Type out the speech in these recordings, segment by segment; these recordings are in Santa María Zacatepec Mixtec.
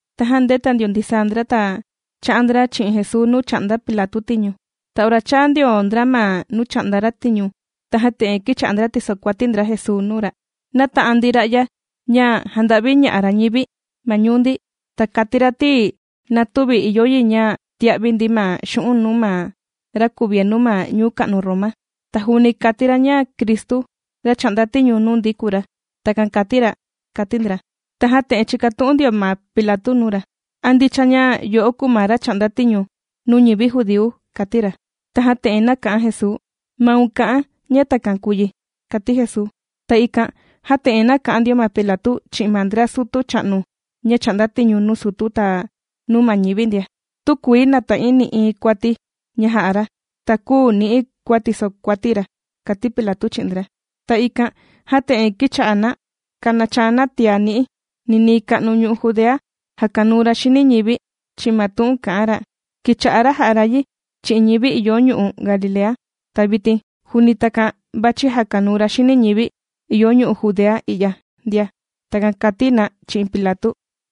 Tajan ndēta ndio ndisaa ndra ta chā'an ndra chi'in Jesuu nuu chà'nda Pilatu tiñu. Ta ora chāa ndio ndra ma nuu chà'nda ra tiñu, tajan te'en kīcha'a ndra tìsokuati ndra Jesuu nuu ra: ―Nāta'an ndi ra'ya ña jànda'viña'a ra ñivi ma ñuu ndi. Ta kàti ra ti na tüvi ìyo yi ña tia'vi ndi ma xu'un' nuu ma ra kuvienu ma ñuu ka'nu Roma. Ta juuni kàti ra ña Cristu, ra chà'nda tiñu nuu ndi kùu ra. Takan kàti ra ―kàti ndra. Tajan te'en chīkatu'un ndio ma Pilatu nuu ra: ―¿A ndicha ña yo'o kùu ma ra chà'nda tiñu nuu ñivi judíu? ―kàti ra. Tajan te'en nāka'an Jesuu: ―Maun kà'an ña takan kùu yi ―kàti Jesuu. Ta ikan jan te'en nāka'an ndio ma Pilatu chi'in ma ndra sutu cha'nu ña chà'nda tiñu nuu sutu ta nuu ma ñivi ndia: ―Tükuii nàta'in nï'iin kuati ña jā'a ra, ta küu ni'i̱ kua tisokuati̱ ra ―kàti Pilatu chi'in ndra. Ta ikan jan te'en kīcha'a na kànachaa na tiá ni'i: ―Ninii ka'nu ñu'u' Judea jàkanuu ra xini ñivi chi'in ma tu'un kà'an ra. Kīcha'a ra jà'a ra yi chi'in ñivi ìyo ñu'u' Galilea, ta vitin juuni takan vàchi jakanuu ra xini ñivi ìyo ñu'u' Judea i'ya ndia. ―Takan kàti na chi'in Pilatu.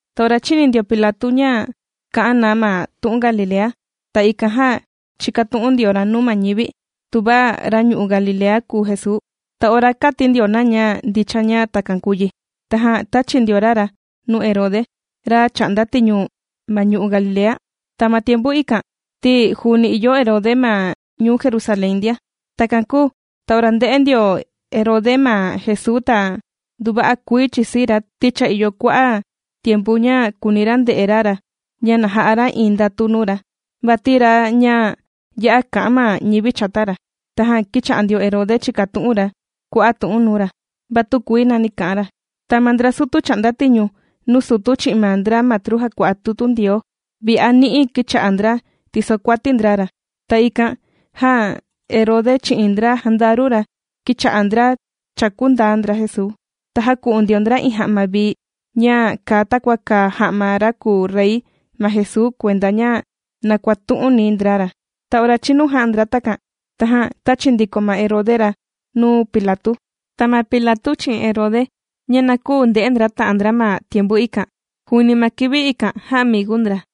Ta ora chīni ndio Pilatu ña kā'an na ma tu'un Galilea, ta ikan jan chīkatu'un ndio ra nuu ma ñivi tuva ra ñu'u' Galilea kùu Jesuu. Ta ora kāti ndio na ña ndicha ña takan kùu yi, tajan tāchi ndio ra ra nuu Herode, ra chà'nda tiñu ma ñu'u' Galilea. Ta ma tiempu ikan ti juuni ìyo Herode ma ñuu Jerusalén ndia. Takan kūu ta ora ndē'e ndio Herode ma Jesuu ta nduva'a kuii chìsii ra, ti cha ìyo kua'a' tiempu ña kùuni ra nde'e ra ra ña na ja'a ra iin ndatu nuu ra, vati iin ra ña ya'a va'a kà'an ma ñivi chata, kùu ra. Tajan kīcha'a ndio Herode chìkatu'un ra kua'a' tu'un nuu ra, va tükuii nani kā'an ra. Ta ma ndra sutu chà'nda tiñu nuu sutu chi'in ma ndra matru jàkua'a tutu Ndioo vi'a ni'i kīcha'a ndra tìsokuati ndra ra. Ta ikan jan, Herode chi'in ndra jandaru ra kīcha'a ndra chàkundaa ndra Jesuu. Ta jāku'un ndio ndra iin ja'ma vii ña kàa takua kàa ja'ma ra kùu rey ma Jesuu kuenda ña na kuàtu'uni ndra ra. Ta ora chīnu jā'a ndra takan, tajan tāchi ndiko ma Herode ra nuu Pilatu. Ta ma Pilatu chi'in Herode, ña na küu nde'e ndra ta'an ndra ma tiempu ikan, juuni ma kivi ikan jaamigu ndra.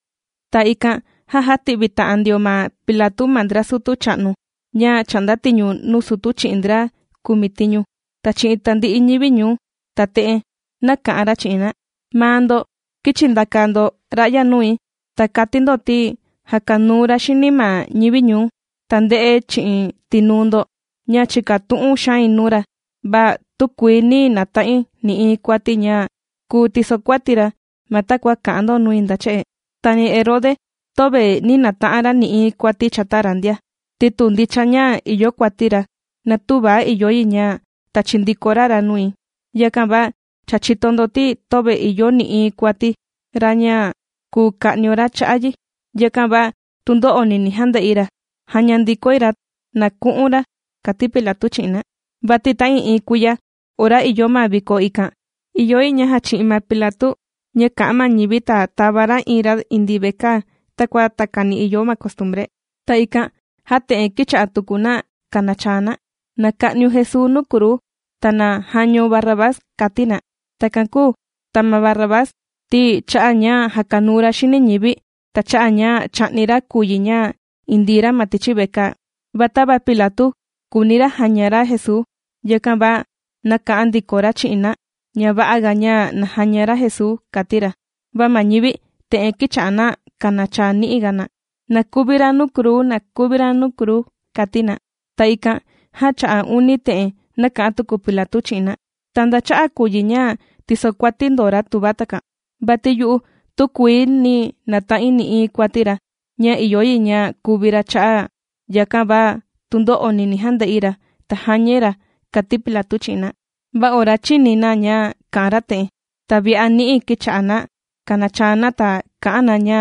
Ta ikan jan jāti'vi ta'an ndio ma Pilatu ma ndra sutu cha'nu ña chà'nda tiñu nuu sutu chi'in ndra kumitiñu ta chi'in tandi'i ñivi ñuu, ta te'en nāka'an ra chi'in na: ―Maa ndo kīchi ndaka ndo ra'ya nui, ta kàti ndo ti jàkanuu ra xini ma ñivi ñuu. Ta ndè'e chi'in tinuu ndo ña chìkatu'un xain nuu ra, va tükuii nī nata'in nï'iin kuati ña kùu tisokuati̱ ra ma takua kà'an ndo nui nda che'e. Ta ni Herode töve nī nata'an ra nï'iin kuati chata ra ndia, ti tu ndicha ña ìyo kuati ra na tüva ìyo yi ña tachi ndiko ra ra nui. Yakan va cha chìto ndo ti töve ìyo nï'iin kuati ra ña kùu ka'nio ra cha'a' yi. Yakan va tundo'oni ni jande'i ra. Jaña ndikoi ra na ku'un ra ―kàti Pilatu chi'in na. Vati ta'ii'iin kuiya ora ìyo ma viko ikan, ìyo yi ña jachi'in ma Pilatu ña kà'an ma ñivi, ta tàva ra iin ra indii vekaa takua takani ìyo ma costumbre. Ta ikan jan te'en kīcha'a tuku na kànachaa na: ―¡Na ka'niun Jesuu nuu kruu, ta na jañaun Barrabás! ―kàti na. Takan kūu ta ma Barrabás ti cha'a' ña jàkanuu ra xini ñivi ta cha'a' ña chà'ni ra kùu yi ña indii ra ma tichi vekaa. Va tava Pilatu kùuni ra jaña ra Jesuu, yakan va nāka'an ndiko ra chi'in na ña va'a ga ña na jaña ra Jesuu, kàti ra. Va ma ñivi te'en kīcha'a na kànachaa ni'i ga na: ―¡Na kuvi ra nuu kruu! ¡Na kuvi ra nuu kruu! ―kàti na. Ta ikan jan cha'a' uni te'en nāka'an tuku Pilatu chi'in na: ―¿Ta nda cha'a' kùu yi ña tìsokuati ndo ra tuva takan? Vati yu'u tükuii nī nata'in nï'iin kuati ra ña ìyo yi ña kuvi ra cha'a', yakan va tundo'oni ni jande'i ra ta jañai ra ―kàti Pilatu chi'in na. Va ora chīni na ña kā'an ra te'en, ta vi'a ni'i kīcha'a na kànachaa na, ta kà'an na ña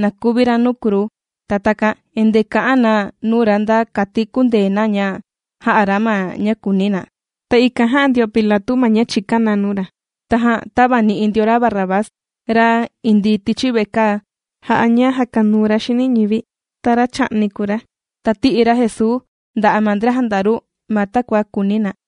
na kuvi ra nuu kruu. Ta takan endee kà'an na nuu ra nda kati kundee na ña jà'a ra ma ña kùuni na. Ta ikan jā'a ndio Pilatu ma ña chìkan na nuu ra, tajan tāvani'i ndio ra Barrabás, ra indii tichi vekaa jà'a ña jàkanuu ra xini ñivi ta ra chà'ni kùu ra. Ta tī'i ra Jesuu nda'a' ma ndra jandaru ma takua kùuni na.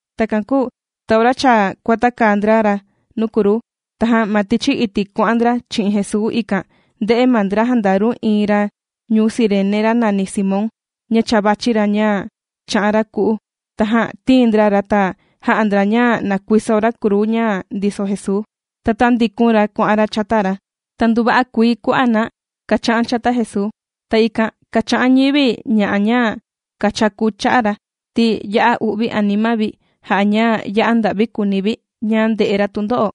Takan kūu ta ora cha kuàtakaa ndra ra nuu kruu, tajan ma tichi iti' kuà'an ndra chi'in Jesuu, ikan ndē'e ma ndra jandaru iin ra ñuu Cirene ra nàni Simón ña cha vàchi ra ña chā'an ra ku'u. Tajan tīin ndra ra ta jā'a ndra ña na kuiso ra kruu ña ndiso Jesuu. Ta tāndikun ra kuà'an ra chata ra. Ta nduva'a kuii kua'a' na kàcha'an chata Jesuu. Ta ikan kàcha'an ñivi ña'a ña kàchaku cha'a' ra, ti ya'a u'vi anima vi jà'a ña ya'a nda'vi kùuni vi ña ndè'e ra tundo'o.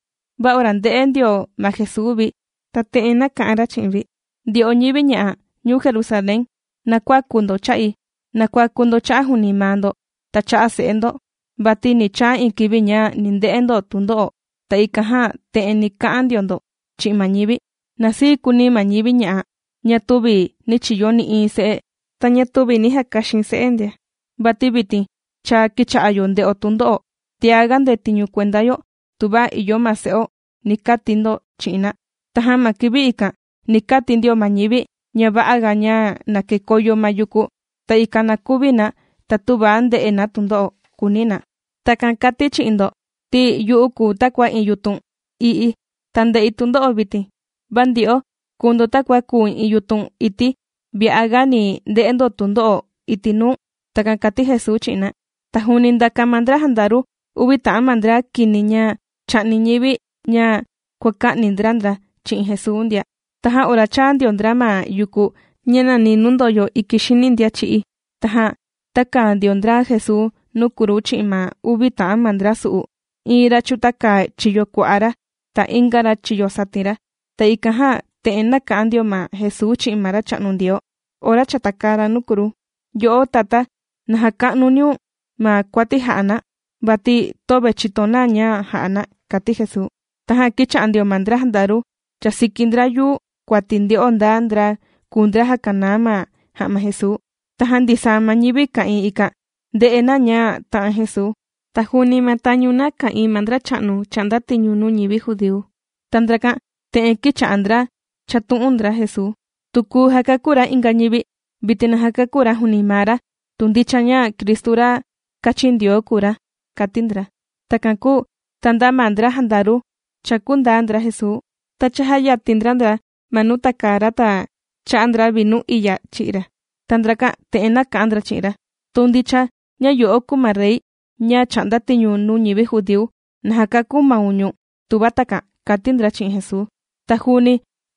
Va ora ndē'e ndio ma Jesuu vi, ta te'en nāka'an ra chi'in vi: ―Ndyo'o ñivi ña'a ñuu Jerusalén, na kuäku ndo cha'i. Na kuaku ndo cha'a' juuni maa ndo ta cha'a' se'e ndo, vati ni chaa iin kivi ña ni nde'e ndo tundo'o, ta ikan jan te'en ni ka'an ndio ndo chi'in ma ñivi: “Na sii kuuni ma ñivi ña'a ña tüvi nī chiyo nï'iin se'e ta ña tüvi nī jakaxin se'e ndia, vati vitin cha kīcha'a yo ndè'o tundo'o, ta tiaga ndetiñu kuenda yo tuva ìyo ma se'o”, ni kati ndo chi'in na. Tajan ma kivi ikan ni kati ndio ma ñivi ña va'a ga ña na kekoyo ma yuku, ta ikan na kuvi na ta tüva nde'e na tundo'o, kùuni na. Takan kàti̱ chi'in ndo ti yu'u kùu takua iin yutun i'ii ta ndè'i tundo'o vitin, va ndyo'o kùu ndo takua kùu iin yutun ití vi'a ga ni nde'e ndo tundo'o iti' nuu. ―Takan kàti Jesuu chi'in na. Ta juuni ndāka ma ndra jandaru uvi ta'an ma ndra kini ña chā'ni ñivi ña kuàka'ni ndra ndra chi'in Jesuu ndia. Tajan ora chāa ndio ndra ma yuku ña nàni nuu ndòyo iki xini ndian chī'í, tajan tākaa ndio ndra Jesuu nuu kruu chi'in ma uvi ta'an ma ndra su'u: iin ra chūtaka chiyo kua'a ra, ta inga ra chiyo satin ra. Ta ikan jan te'en nāka'an ndio ma Jesuu chi'in ma Racha'nu Ndioo ora cha tàkaa ra nuu kruu: ―Yo'o Tatá, na jaka'nuniun ma kuati jà'a na, vati töve chìto na ña jà'a na ―kàti Jesuu. Tajan kīcha'a ndio ma ndra jandaru chàsiki ndra yuu kuati, nde'o nda ndra kùu ndra jàkanaa ma ja'ma Jesuu. Tajan ndisaa ma ñivi ka'ìin ikan ndē'e na ña tā'an Jesuu, ta juuni ma tañu na ka'ìin ma ndracha'nu chà'nda tiñu nuu ñivi judíu. Ta ndrakan te'en kīcha'a ndra chàtu'un ndra Jesuu: ―Tu kūu jakakú ra inga ñivi, vitin na jakakú ra juuni maa ra tu ndicha ña Cristu ra kāchin Ndioo kùu ra ―kàti ndra. Takan kūu ta nda ma ndra jandaru chàkú ndaa ndra Jesuu, ta chājayatin ndra ndra ma nuu tàkaa ra, ta chà'a ndra vinu iya chì'i ra, ta ndrakan te'en nāka'an ndra chi'in ra: ―¡Tu ndicha ña yo'o kùu ma rey ña chà'nda tiñu nuu ñivi judíu, na jakakú maun ñu̱n tuva takan! ―kàti ndra chi'in Jesuu. Ta juuni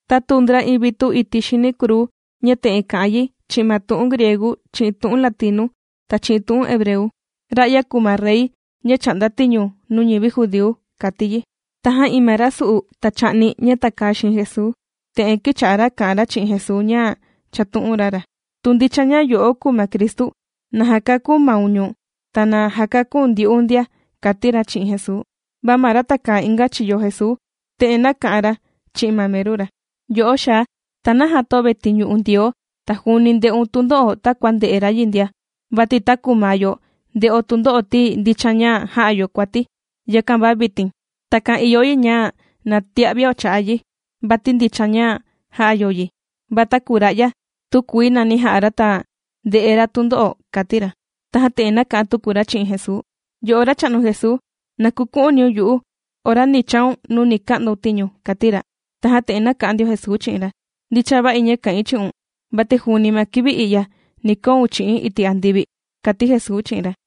tātuu ndra iin vitu iti' xini kruu ña te'en kà'an yi chi'in ma tu'un griegu, chi'in tu'un latinu, ta chi'in tu'un hebreu: “Ra'ya kùu ma rey ña chà'nda tiñu nuu ñivi judíu”, kàti yi. Tajan iin ma ra sù'u ta chà'ni ña tàkaa xiin Jesuu, te'en kīcha'a ra kà'an ra chi'in Jesuu ña chàtu'un ra ra: ―¡Tu ndicha ña yo'o kùu ma Cristu, na jakakú maun ñu̱n ta na jakaku̱n ndyu'u ndia! ―kàti ra chi'in Jesuu. Va ma ra tàkaa inga chiyo Jesuu, te'en nāka'an ra chi'in ma meru ra: ―Yo'o xaa, ¿ta naja töve tìñu'u̱n Ndioo ta juuni ndè'un tundo'o takua ndè'e ra yi ndia? Vati taku maa yo ndè'o tundo'o ti ndicha ña jā'a yo kuati. Yakan va vitin takan ìyo yi na tia'vio cha'a' yi. Vati ndicha ña jā'a yo yi, va taku ra'ya, tükuii nani jà'a ra ta ndè'e ra tundo'o ―kàti ra. Tajan te'en nāka'an tuku ra chi'in Jesuu: ―Yo'o Racha'nu Jesuu, na kuku'uniun yu'u ora ni chaun nuu ni ka'ndaun tiñu ―kàti ra. Tajan te'en nāka'an ndio Jesuu chi'in ra: ―Ndicha va'i ña ka'in chi'un, vati juuni ma kivi i'ya ni koun chi'i̱n iti' andivi ―kàti Jesuu chi'in ra.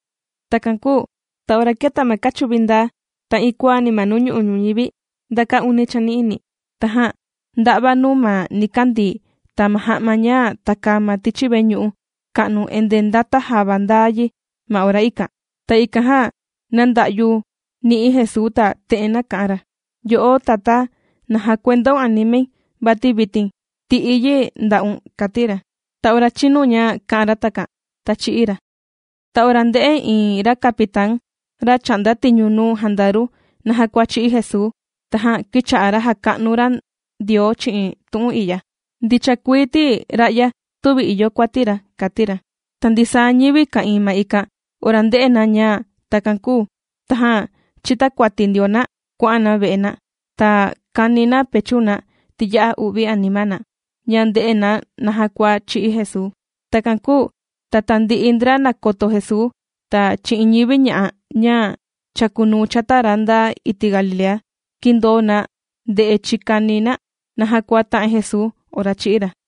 Takan kūu ta ora kēta ma kachuvi ndaa, ta iin kuaani ma nuu ñu'u' ñuñivi nda kaa uni chani'ini. Tajan ndā'va nuu ma nikandii ta ma ja'ma ña tàkaa ma tichi veñu'u ka'nu, endee ndāta java ndaa yi ma ora ikan. Ta ikan jan nānda'yu ni'i Jesuu ta te'en nāka'an ra: ―Yo'o Tatá, na jàkuendaun animai, vati vitin tì'i̱ yi nda'un ―kàti ra. Ta ora chīnu ña kā'an ra takan, ta chī'í ra. Ta ora ndē'e iin ra capitán, ra chà'nda tiñu nuu jandaru naja kua chī'í Jesuu, tajan kīcha'a ra jàka'nu ra Ndioo chi'in tu'un i'ya: ―Ndicha kuii ti ra'ya tüvi ìyo kuati ra ―kàti ra. Ta ndisaa ñivi ka'ìin ma ikan ora ndē'e na ña takan kūu, tajan chītakuati ndio na kuà'an na ve'e na. Ta kàni na pechu na ti ya'a u'vi anima na ña ndè'e na naja kua chī'í Jesuu. Takan kūu ta tandi'i ndra nàkoto Jesuu ta chi'in ñivi ña'a ña chākunuu chata ra nda iti' Galilea, kīndoo na nde'e chikani na naja kua tā'an Jesuu ora chī'í ra.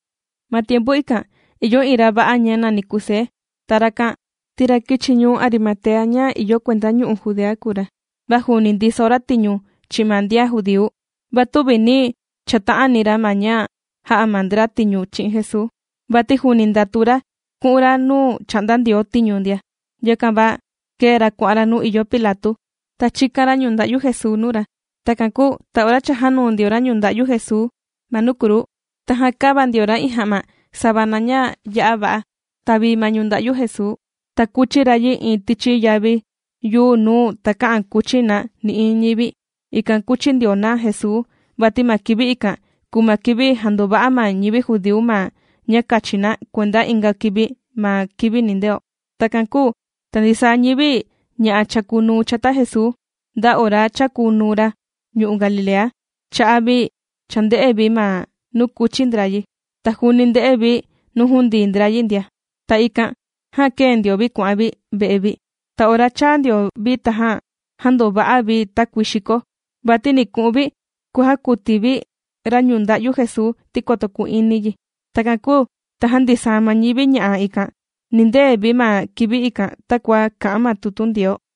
Ma tiempu ikan ìyo iin ra va'a ña nàni Kusé, ta rakan ti ra kīchi ñuu Arimatea ña ìyo kuenda ñu'u' Judea kùu ra. Va juuni ndiso ra tiñu chi'in ma ndian judíu. Va tüvi nī chata'ani ra ma ña jā'a ma ndra tiñu chi'in Jesuu, vati juuni ndàtu ra ku'un ra nuu chà'nda Ndioo tiñu ndia. Yakan va kēe ra kuà'an ra nuu ìyo Pilatu, ta chīkan ra ñunda'yu Jesuu nuu ra. Takan kūu ta ora cha jānuu ndio ra ñunda'yu Jesuu ma nuu kruu, tajan kāva ndio ra iin ja'ma savana ña ya'a va'a ta vii ma ñunda'yu Jesuu, ta kūchi ra yi iin tichi yavi yuu nuu takä'an kuchi na nï'iin ñivi. Ikan kūchi ndio na Jesuu vati ma kivi ikan kùu ma kivi jandova'a ma ñivi judíu ma ña kachi na kuenda inga kivi, ma kivi nindeo. Takan kūu ta ndisaa ma ñivi ña'a chākunuu chata Jesuu nda ora chākunuu ra ñu'u' Galilea, chā'an vi chānde'e vi ma nuu kūchi ndra yi. Ta juuni ndē'e vi nuu jundii ndra yi ndia. Ta ikan jan kēe ndio vi kuà'an vi ve'e vi. Ta ora chāa ndio vi tajan jāndova'a vi takuii xiko, vati ni ku'un vi kujakuti vi ñunda'yu Jesuu ti koto ku'ini yi. Takan kūu tajan ndisaa ma ñivi ña'a ikan nīndee vi ma kivi ikan takua kà'an ma tutu Ndioo.